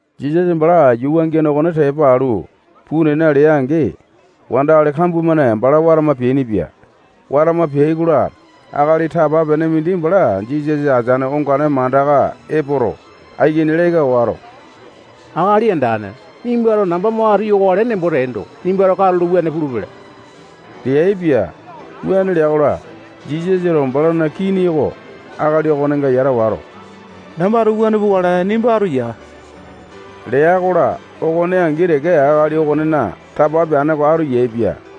Jisasa bala yuu wangiane okone tepa alu, puu nena lea-angi, wandakali kambua-mane bala watama peainipia. Watama peai-kola, akali tapa-pene mindi bala Jisasa ateane ongane mandaka epoto, aikini leka wato, Akali Andane, nimbato namba mo atu yokale nembo teendo, nimbato katulo wuane pulupele leaipia. Wuane lea-kola, Jisasato balana kini oko akali okonenga yata wato, nambato wuane pukale. Nimba atu yaa lea-kola, okone angi teke akali okonena tapa peane oko atu yaepia.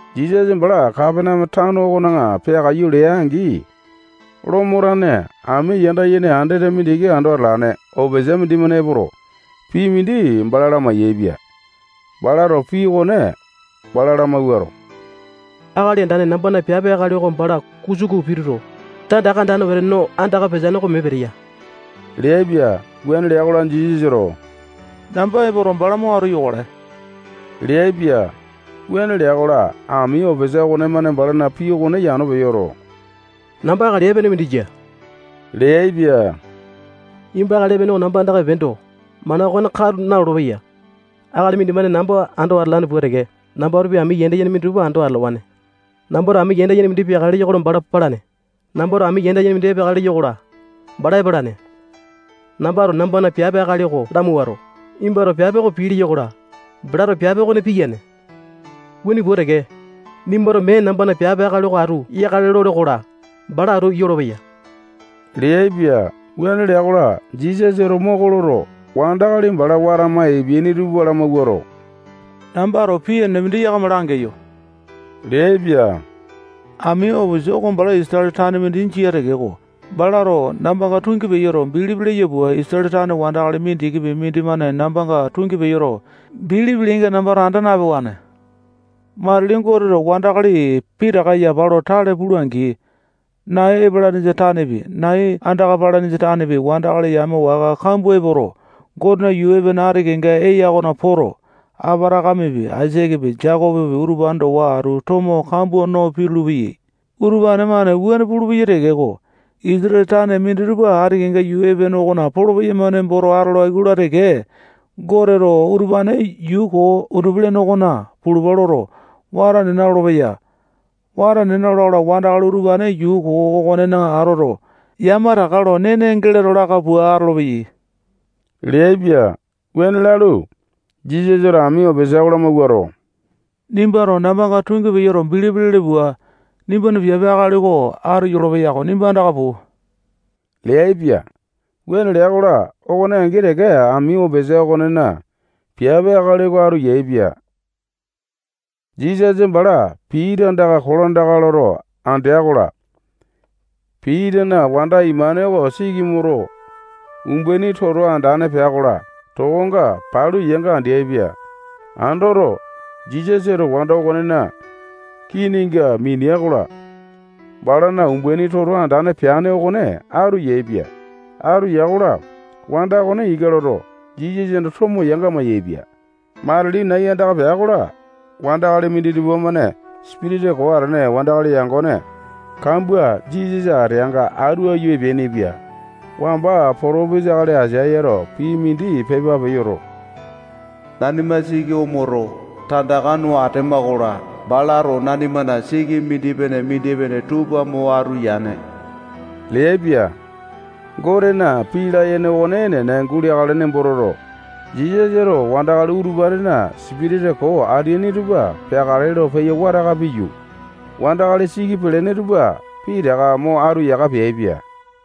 Jisasa bala Kapaneame tano okona peakaiyu lea-angi, Lomo tane ami yanda yene andete mindiki ando atalane opisa mindimane epoto, pii mindi bala lamai-yaepia. Balato pii okone bala lamawuato, Akali Andane, nambana piape akali oko bala kusuku pituto, tandaka andane wete no andaka peteane oko mee peteya leaipia. Wuane lea-kola, Jisasato namba epoto, bala mo atu yokale leaipia. Wuane lea-kola, ami opisa okonemane balana pii okone yano peyoto, namba akali epene mindi jia leaipa. Nimba akali epene oko nambana andaka epeendo, mana okone katu nalolo-peya. Akali mindimane namba ando atalane pua teke, nambatopi ami yanda yene minditupa ando atalawane. Nambato ami yanda yene mindi peakale leyo-kola, bala palane. Nambato ami yanda yene mindi epeakale leyo-kola, bala epalane. Nambato nambana piape akali oko lamawuato, nimbato piape oko pii leyo-kola, balato piape okone piyane. Wuane pua teke, nimbato mee nambana piape akali oko atu yakale lole-kola, bala atu yolopeya leaipia. Wuane lea-kola, Jisasato moko loto, wandakali bala watama epeaini tupa lamawuato, nambato pii enene mindi yakama langeyo leaipia. Ami opisa oko bala Isatale tane mindi jia tekeko, balato nambanga tungi peyoto, bilipi leya pua, Isatale tane wandakali mindikipi mindimane nambanga tungi peyoto, bilipi leyainga nambato anda napewane. Matili Goteto wandakali pitaka yapa lo tale pula-angi, nai epalanesa tanepi, nai andaka palanesa tanepi, wandakali yame waka kambua epoto, Gotena yuu epene ati kenga eya okona poto, Apatakamepi, Aisakepi, Jekopopi, utupane towa atu tomo kambua no pitulu-peyai. Utupane-mane wuane pulupeyai tekeko, Isatale tane minditupa ati kenga yuu epene okona polo-peyama nemboto atolai-kola teke, Goteto utupane yuu koo undupi-lene okona pulupa loto, wata nena lolopeya. Wata nena lola-kola, wandakali utupane yuu koo okonena atoto, yamataka lo nene geleto laka pua atolopeyai leaipia. Wuane lalu, Jisasato ami opisa oko lamawuato, nimbato nambanga tungi peyoto, bilipi lele pua, nimbana piape akali oko atu yolopeya-ko. Nimba andaka puu leaipia. Wuane lea-kola, okone angi teke ami opisa okonena piape akali oko atu yaepia. Jisasa bala Pita andaka kolandaka loto andea-kola, Pitana wanda imane oko siki omoto, umbaini toto andane pea-kola, tokonga palu yanga andeaipia. Andoto, Jisasato wanda okonena kininga minea-kola, balana umbaini toto andane peane okone atu yaepia. Atu ya-kola, wanda okone ika loto, Jisasana tomo yanga mayaepia. Matili, nai andaka pea-kola, wandakali minditupa-mane sipitisa koo atene wandakali yangone kambua Jisasa ateanga atu aiyu epeainipia. Wamba potopesa akali Aisayato pii mindi pepa peyoto, nanima siki omoto, tandaka no atema-kola, balato nanimana siki mindipene-mindipene tupa mo atu yane leaipia. Gotena pii layene okone enene guleakale nembo toto, Jisasato wandakali utupanena sipitisa koo ateaini tupa peakale lo peyo wataka piyu, wandakali siki pelene tupa pitaka mo atu yaka peaipia.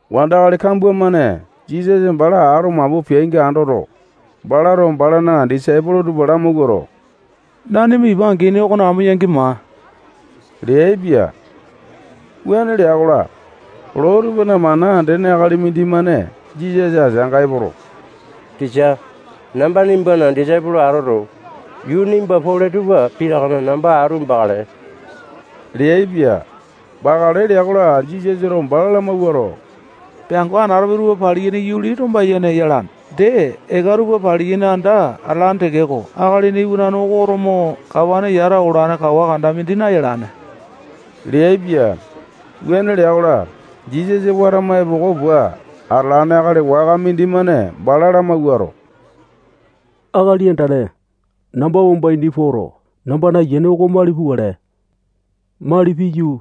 Wandakali kambua-mane Jisasa bala ato mapu peainga andoto, balato balana disaipolo tupa lamawuato, nanima ipa angini okona amo yangi maa leaipia. Wuane lea-kola, loo tupana mana andene akali mindimane Jisasa ateanga epoto, tisa, namba nimbana disaipolo atoto, yuu nimba pole tupa pitakana namba atu bakale leaipia. Bakale lea-kola, Jisasato bala lamawuato, peango anatope tupana pangulane yuli tomba-yene yalane. Dee, eka tupana paliyaini anda atalane tekeko, Akalina Iwanane oko oto mo kawane yata olane kawa kanda mindi nayalane leaipia. Wuane lea-kola, Jisasa watama epoko pua atalane akali waka mindimane bala lamawuato, Akali Andane, namba wamba ini poto, nambana ayiane oko mali pukale. Mali piyu,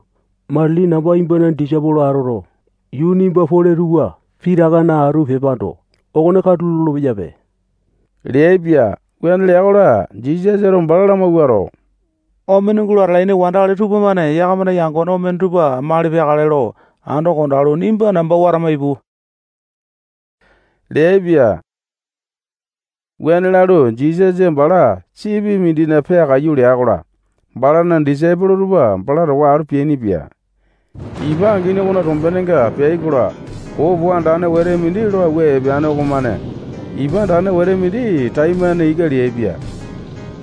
matili namba nimbana disaipolo atoto, yuu nimba pole tupa pitakana atu pepando, okone katu lolo-peyape leaipia. Wuane lea-kola, Jisasato bala lamawuato, omene gulo atalaini wandakali tupamane yakamana yangone omene tupa mali peakale lo ando kondalu, nimbato namba watama ipu leaipia. Wuane lalu, Jisasa bala sipi mindina peakaiyu lea-kola, balana disaipolo tupa bala towa atu peainipia. Ipa angini okona tombenenga peai-kola, popo andane wete mindi lo awua epeane okomane ipa andane wete mindi taimane ika leaipia.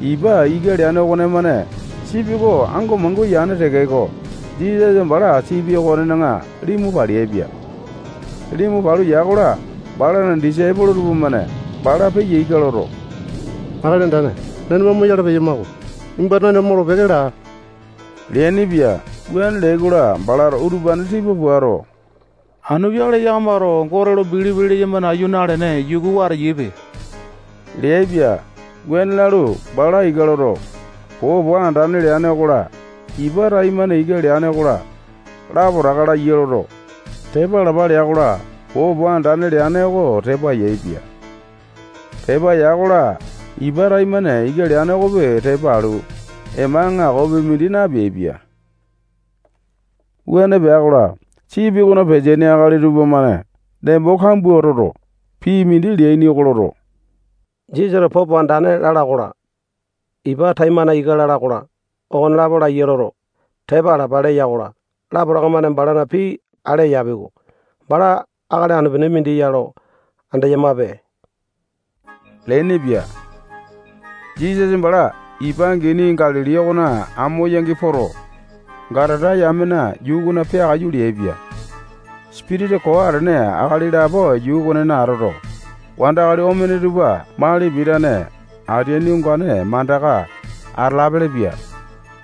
Ipa ika leane okonemane sipi oko ango mangua yane tekeko, Jisasa bala sipi okonena limu paleaipia. Limu palu ya-kola, balana disaipolo tupamane bala peya ika loto, Akali Andane, nanima omoyale peyama-ko. Nimbato nanima molo-peke laa leainipia. Wuane leai-kola, balato utupane tipa puato, anu peakale yakamato Gote lo bilipi leyama nayu nalene, yukuwa ateyaipe leaipia. Wuane lalu, bala ika loto, popo andane leane okola, ipa taimane ika leane okola, lapotaka laiya loto, tepa alapa lea-kola, popo andane leane oko tepa yaepia. Tepa ya-kola, ipa taimane ika leane okopi tepa alu, ema aŋakopi mindi napeaipia. Wuane pea-kola, sipi okona peteaini akali tupamane nembo kambua toto, pii mindi leaini oko loto, Jisasato popo andane lala okola, ipa taimane ika lala okola, okonelapo laiya loto, tepa alapa leya-kola, lapotaka-mane balana pii ale eyapi-ko. Bala akali anu-pene mindi ya andeyamape leainipia. Jisasa bala ipa angini Galili okona amo yangi poto, Gatata yamena yuu okona peakaiyu leaipia. Sipitisa koo atene akali lapo yuu okonena atoto, wandakali omene tupa mali pitane ateaini ongane mandaka atalapele-pia.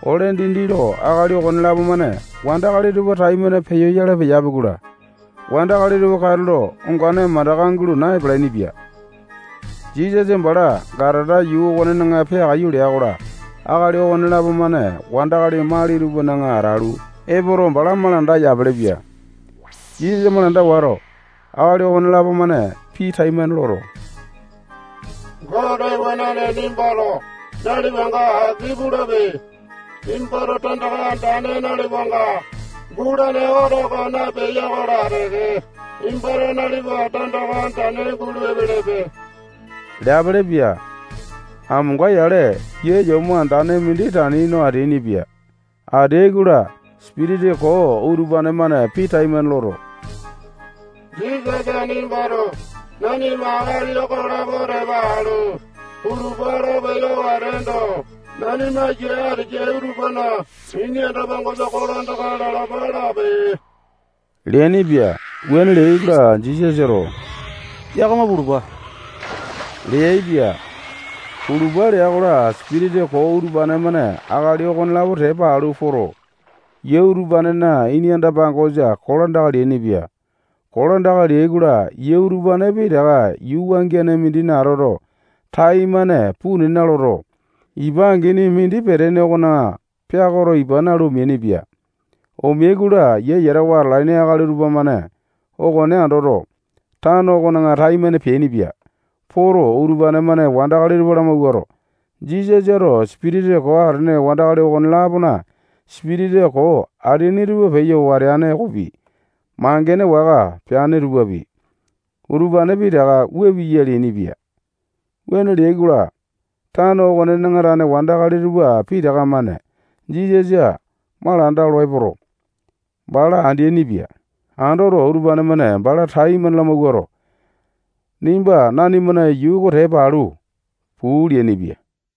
Ole dindi lo akali okonelapo-mane wandakali tupa taimane peyoyale peyapi-kola, wandakali tupa katulo ongane mandaka gulo na-palainipia. Jisasa bala Gatata yuu okonena peakaiyu lea-kola, akali okonelapo-mane wandakali mali tupana atalu epoto, bala malanda yapelepia. Jisasa malanda wato, akali okonelapo-mane pii taimane loto, Gote Iwanane nimbato nalipanga aki pulape. Nimbato tandaka andane nalipanga gulane oto oko naepeya-kola teke, nimbato nalipa tandaka andane gulu epelepe leapelepia. Amonga-yale yia yomo andane mindi tani no ateainipia. Ateai-kola, sipitisa koo utupane-mane pii taimane loto, Jisasa nimbato nanima akali okolapo tepa alu pulupa lo peyo wateendo, nanima yia ateyai utupana ini anda-pangosa kolandaka lalapa lape leainipia. Wuane leai-kola, Jisasato yakama pulupa leaipia. Pulupa lea-kola, sipitisa koo utupane-mane akali okonelapo tepa alu poto, yia utupanena ini pangosa kolandaka leainipia. Kolandaka leai-kola, yia utupane pitaka yuu wangiane mindina atoto, taimane puu nena loto, ipa angini mindi peteane okona peakoto, ipa nalu, omeainipia. Omeai-kola, yia yatawa atalaini akali tupamane okone andoto, tano okona taimane peainipia. Poto, utupane-mane wandakali tupa lamawuato, Jisasato sipitisa koo atene akali okone-lapona sipitisa koo ateaini tupa peyo wateane okopi, mangene waka peane tupapi, utupane pitaka wua piya leainipia. Wuane leai-kola, tano okonena tane wandakali tupa pitaka-mane Jisasa malanda olo epoto, bala andeaini-pia. Andoto, utupane-mane bala taimane lamawuato, nimba nanimana yuu oko tepa alu puu leainipia.